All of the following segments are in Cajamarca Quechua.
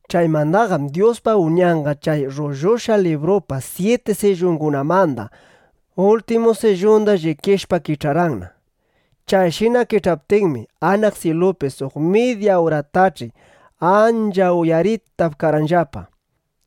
Chaymandaqam Dyuspa Uñanqa chay rrullushqa librupa syiti sillungunamanda ultimu sillunda llikishpa kich'arqanna. Chayshina kich'aptinmi, anaq syilupi suq midya uratach'i ancha uyaritap karqanllapa.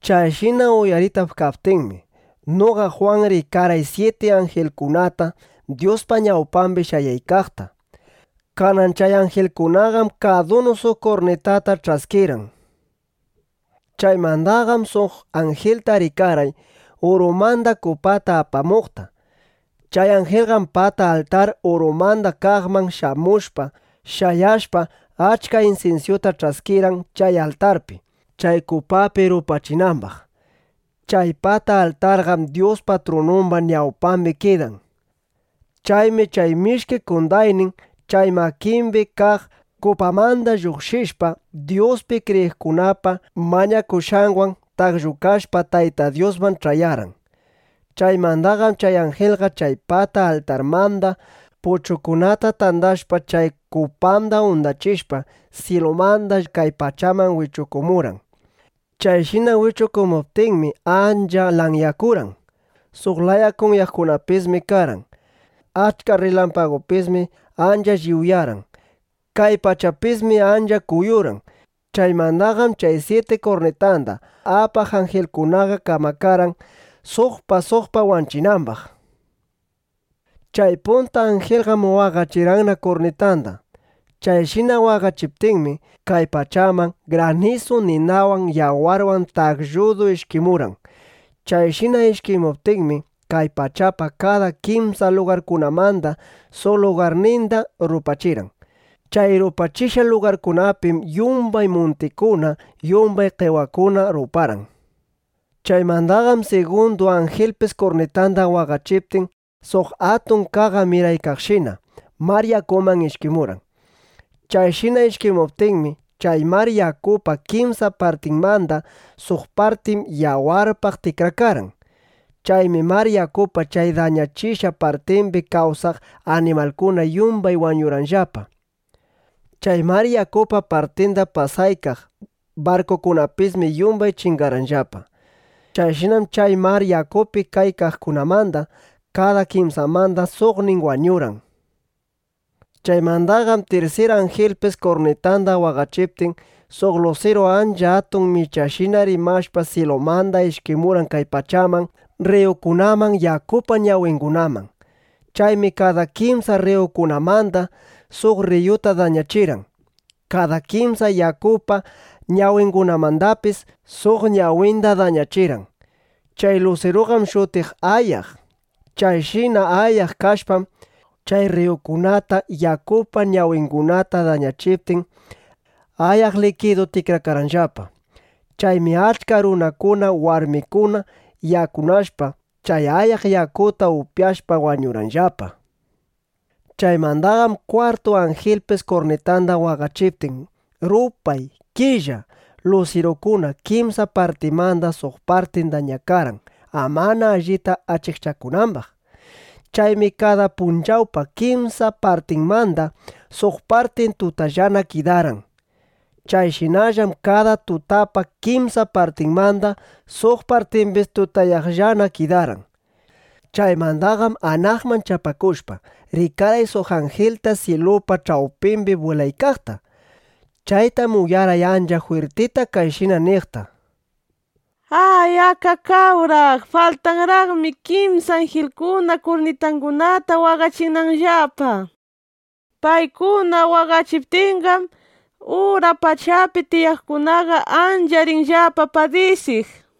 Chayshina uyaritap kaptinmi, noqa Jwan rikarqay syiti anjilkunata Dyuspa ñawpambi shayaykaqta. Kanan chay anjilkunaqam kadunu suq kurnitata ch'askirqan. Chaymandaqam suq anjilta rikarqay urumanda kupata apamuqta. Chay anjilqam pata altar urumanda kaqman shamushpa, shayashpa, achka insinsyuta ch'askirqan, chay altarpi, chay kupapi rupachinambaq. Chay pata altarqam Dyuspa trunumba ñawpambi kidan. Chaymi chay mishki qondaynin chay makimbi kaq kupamanda lluqshishpa, Dyuspi kriyiqkunapa mañakushqanwan taqllukashpa Tayta Dyusman ch'ayarqan. Chaymandaqam chay anjilqa chay pata altarmanda puchukunata tandashpa, chay kupanda undachishpa, syilumanda kay pachaman wichukumurqan. Chayshina wichukumuptinmi, ancha lanyakurqan. Suq laya kunyaqkunapismi karqan. Achka rrilampagupismi ancha lliwyarqan. Kay pachapismi ancha kuyurqan. Chaymandaqam chay syiti kurnitanda apaq anjilkunaqa kamakarqan, suqpa suqpa waqachinambaq. Chay punta anjilqam waqachirqanna kurnitanda. Chayshina waqachiptinmi, kay pachaman granisu ninawan yawarwan taqlludu ishkimurqan. Chayshina ishkimuptinmi, kay pachapa kada kimsa lugarkunamanda suq lugarninda rupachirqan. Chay rupachishqa lugarkunapim yumbay muntikuna, yumbay qewakuna ruparqan. Chaymandaqam sigundu anjilpis kurnitanda waqachiptin, suq atun qaqa miraykaqshina mar yakuman ishkimurqan. Chayshina ishkimuptinmi, chay mar yakupa kimsa partinmanda suq partin yawarpaq tikrakarqan. Chaymi mar yakupa chay dañachishqa partimbi kawsaq animalkuna yumbay wañurqanllapa. Chay mar yakupa partinda pasaykaq barkukunapismi yumbay chingarqanllapa. Chayshinam chay mar yakupi kaykaqkunamanda kada kimsamanda suqnin wañurqan. Chaymandaqam tirsir anjilpis kurnitanda waqachiptin, suq lusiru ancha atun michashina mirashpa syilumanda ishkimurqan kay pachaman, rriyukunaman, yakupa ñawingunaman. Chaymi kada kimsa rriyukunamanda suq rriyuta dañachirqan. Kada kimsa yakupa ñawingunamandapis suq ñawinda dañachirqan. Chay lusiruqam shutiq Ayaq. Chayshina ayaq kashpam, chay rriyukunata, yakupa ñawingunata dañachiptin, ayaq likiduna tikrakarqanllapa. Chaymi achka runakuna warmikuna yakunashpa, chay ayaq yakuta upyashpa, wañurqanllapa. Chaymandaqam kwartu anjilpis kurnitanda waqachiptin, rupay, killa, lusirukuna kimsa partinmanda suq partin dañakarqan, amana allita achikchakunambaq. Chaymi kada punchawpa kimsa partinmanda suq partin tutallana kidarqan. Chayshinallam kada tutapa kimsa partinmanda suq partimbis tutayaqllana kidarqan. Chaymandaqam anaqman chapakushpa, rikarqay suq anjilta syilupa ch'awpimbi bwilaykaqta. Chaytam uyarqay ancha jwirtita kayshina niqta: —¡Ay, akakawraq! Faltanraqmi kimsa anjilkuna kurnitangunata waqachinanllapa. ¡Paykuna waqachiptinqam, ura pachapi tiyaqkunaqa ancha rinllapa padisiq! nishpa.